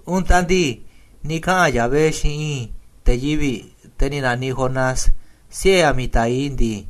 Untaꞌ ndii, ni̱ kaꞌa̱n Yahvé xiinꞌ i̱i̱n te̱ yivi̱ꞌ, te̱ ni̱ na̱niꞌ Jonás, siꞌe̱ Amitai ndii: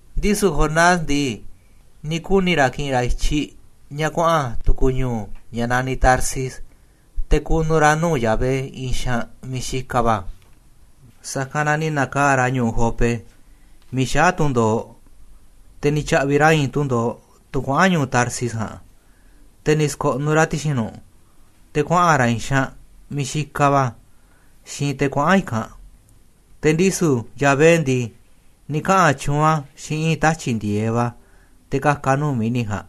Ndisu̱ Jonás ndii, ni̱ kuni̱ ra̱ ki̱ꞌi̱n ra̱ i̱tyiꞌ ña̱ kuaꞌa̱n tu̱ku̱ ñu̱u̱, ña̱ naniꞌ Tarsis, te̱ ku̱nu̱ ra̱ nuu̱ꞌ Yahvé i̱i̱n xaanꞌ miiꞌ xikaꞌ va̱. Sa̱kanꞌ na ni̱ na̱kaa̱ꞌ ra̱ ñu̱u̱ Jope miiꞌ xaá tundo̱oꞌ, te̱ ni̱ tya̱ꞌvi̱ ra̱ i̱i̱n tundo̱oꞌ, tunꞌ kuaꞌa̱n ñu̱u̱ Tarsis ja̱a̱nꞌ, te̱ ni̱ sko̱ꞌnuꞌ ra̱ ti̱xi̱n nu̱ꞌ, te̱ kuaꞌa̱n ra̱ i̱i̱n xaanꞌ miiꞌ xikaꞌ va̱ xiinꞌ te̱ kuaꞌa̱n i̱kanꞌ. Te̱ ndisu̱, Yahvé ndii, ni̱ kaꞌa̱n tyuunꞌ a̱ xiinꞌ i̱i̱n tatyi̱ꞌ ndi̱e̱eꞌ va̱ te̱ ka̱ka̱ a̱ nuu̱ꞌ mi̱ni̱ ja̱a̱nꞌ,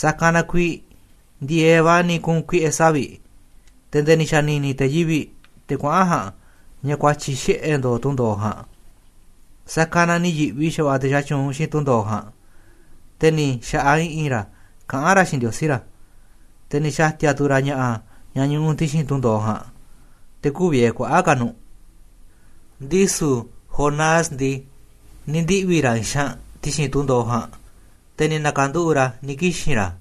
sa̱kanꞌ na kuiiꞌ ndi̱e̱eꞌ va̱ ni̱ ku̱u̱n kuiꞌe̱ savi̱ꞌ, te̱ nde̱e̱ ni̱ xa̱ni̱ni̱ te̱ yivi̱ꞌ, te̱ kuaꞌa̱n ja̱a̱nꞌ, ña̱ kua̱tyi̱ xiꞌe̱ ndo̱o̱ tundo̱oꞌ ja̱a̱nꞌ. Sa̱kanꞌ na ni̱ yi̱ꞌvi xa̱va̱ꞌa̱ te̱ xatyuunꞌ xiinꞌ tundo̱oꞌ ja̱a̱nꞌ, te̱ ni̱ xa̱ꞌaꞌ i̱ꞌi̱n ra̱ kaꞌán ra̱ xiinꞌ ndiosí ra̱, te̱ ni̱ xa̱ti̱a̱ tu̱ ra̱ ña̱ꞌa̱ ña̱ ñuꞌuꞌ ti̱xi̱n tundo̱oꞌ ja̱a̱nꞌ, te̱ kü̱u̱ vie̱ kuaꞌa̱ꞌ ka̱ nu̱ꞌ. Ndisu̱ Jonás ndii, ni̱ ndiꞌvi̱ ra̱ i̱i̱n xaanꞌ ti̱xi̱n tundo̱oꞌ ja̱a̱nꞌ, te̱ ni̱ na̱ka̱nduꞌu̱ꞌ ra̱ ni̱ kixi̱n ra̱.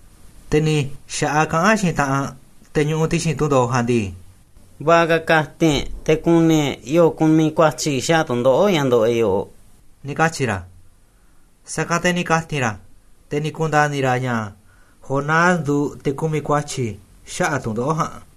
Te̱ ni̱ xa̱ꞌaꞌ kaꞌán xiinꞌ taꞌanꞌ te̱ ñuꞌuꞌ ti̱xi̱n tundo̱oꞌ ja̱a̱nꞌ ndii: ―Va̱ꞌa̱ ka̱ ka̱ti̱n e̱ꞌ te̱ ku̱ni̱ e̱ꞌ yo̱o̱ kumiꞌ kua̱tyi̱ xaꞌa̱ꞌ tu̱ndoꞌo̱ꞌ ña̱ ndoꞌoꞌ e̱ꞌ yoꞌoꞌ ―ni̱ katyi̱ ra̱. Sa̱kanꞌ te̱ ni̱ ka̱ti̱n ra̱ te̱ ni̱ ku̱nda̱ni̱ ra̱ ña̱ Jonás nduuꞌ te̱ kumiꞌ kua̱tyi̱ xaꞌa̱ꞌ tu̱ndoꞌo̱ꞌ ja̱a̱nꞌ.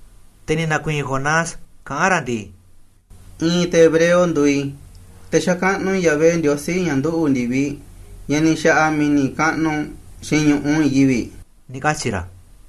Te̱ ni̱ na̱kui̱i̱n Jonás kaꞌán ra̱ ndii: ―I̱i̱n te̱ hebreo nduuꞌ i̱, te̱ xakaꞌnuꞌ i̱ Yahvé, Ndiosí, ña̱ nduꞌu̱ꞌ ndi̱viꞌ, ña̱ ni̱ xa̱ꞌa̱ mi̱ni̱ kaꞌnuꞌ xiinꞌ ñu̱ꞌuꞌ i̱i̱n yivi̱ꞌ ―ni̱ katyi̱ ra̱.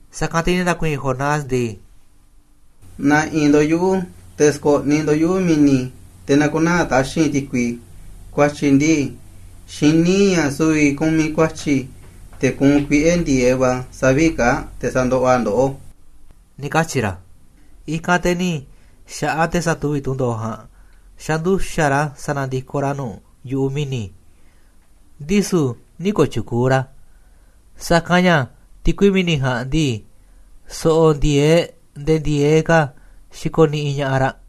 Sa̱kanꞌ te̱ ni̱ na̱kui̱i̱n Jonás ndii: ―Na̱ꞌi̱n ndo̱ꞌ yuꞌu̱ te̱ sko̱ꞌniꞌ ndo̱ꞌ yuꞌu̱ mi̱ni̱, te̱ na̱ku̱naa̱ taxi̱nꞌ ti̱kui. Kua̱tyi̱ ndii, xiní i̱ ña̱ su̱vi̱ i̱ kumiꞌ kua̱tyi̱ te̱ kuunꞌ kuiꞌe̱ ndi̱e̱eꞌ va̱ savi̱ꞌ kaa̱ꞌ, te̱ sandoꞌoꞌ a̱ ndoꞌó ―ni̱ katyi̱ ra̱. I̱kanꞌ te̱ ni̱ xa̱ꞌaꞌ te̱ satuvi̱ꞌ tundo̱oꞌ ja̱a̱nꞌ xanduxa̱ꞌ ra̱ sa̱na̱ndikoꞌ ra̱ nu̱ꞌ yu̱ꞌuꞌ mi̱ni̱, ndisu̱ nï̱ kooꞌ tyukuuꞌ ra̱, sa̱kanꞌ ña̱ ti̱kui mi̱ni̱ ja̱a̱nꞌ ndii, so̱ꞌo̱ ndi̱e̱eꞌ nde̱e̱ ndi̱e̱eꞌ ka̱ xikoꞌ niꞌiꞌ ña̱ꞌaꞌ raꞌ.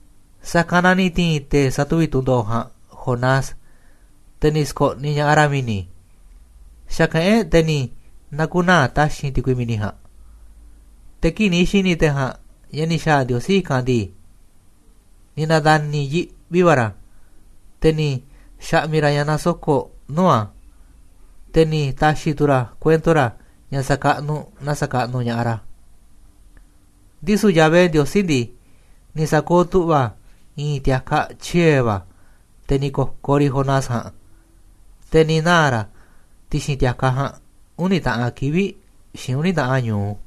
Sa̱kanꞌ na ni̱ ti̱i̱n te̱ satuvi̱ꞌ tundo̱oꞌ ja̱a̱nꞌ Jonás, te̱ ni̱ sko̱ꞌniꞌ ña̱ꞌaꞌ ra̱ mi̱ni̱, xa̱kaꞌán e̱ꞌ te̱ ni̱ na̱ku̱naa̱ taxi̱nꞌ ti̱kui mi̱ni̱ ja̱a̱nꞌ. Te̱ kii̱ꞌ ni̱ xi̱ni̱ te̱ ja̱a̱nꞌ ña̱ ni̱ xa̱a̱ Ndiosí i̱kanꞌ ndii, ni̱ na̱nda̱ni̱ yiꞌvi va̱ ra̱, te̱ ni̱ xa̱ꞌmi̱ ra̱ ña̱ nasoko̱ꞌ nuu̱ꞌ a̱, te̱ ni̱ ta̱xi̱ tu̱ ra̱ kuento ra̱ ña̱ sa̱kaꞌnuꞌ naa sa̱kaꞌnuꞌ ña̱ꞌaꞌ ra̱. Ndisu̱ Yahvé Ndiosí ndii, ni̱ sa̱kooꞌ tu̱ꞌva̱ a̱ i̱i̱n ti̱a̱kaꞌ tyie̱ va̱ te̱ ni̱ ko̱koꞌ riꞌ Jonás ja̱a̱nꞌ, te̱ ni̱ naa̱ ra̱ ti̱xi̱n ti̱a̱kaꞌ ja̱a̱nꞌ uni̱ taꞌan kivi̱ꞌ xiinꞌ uni̱ taꞌan ñu̱u.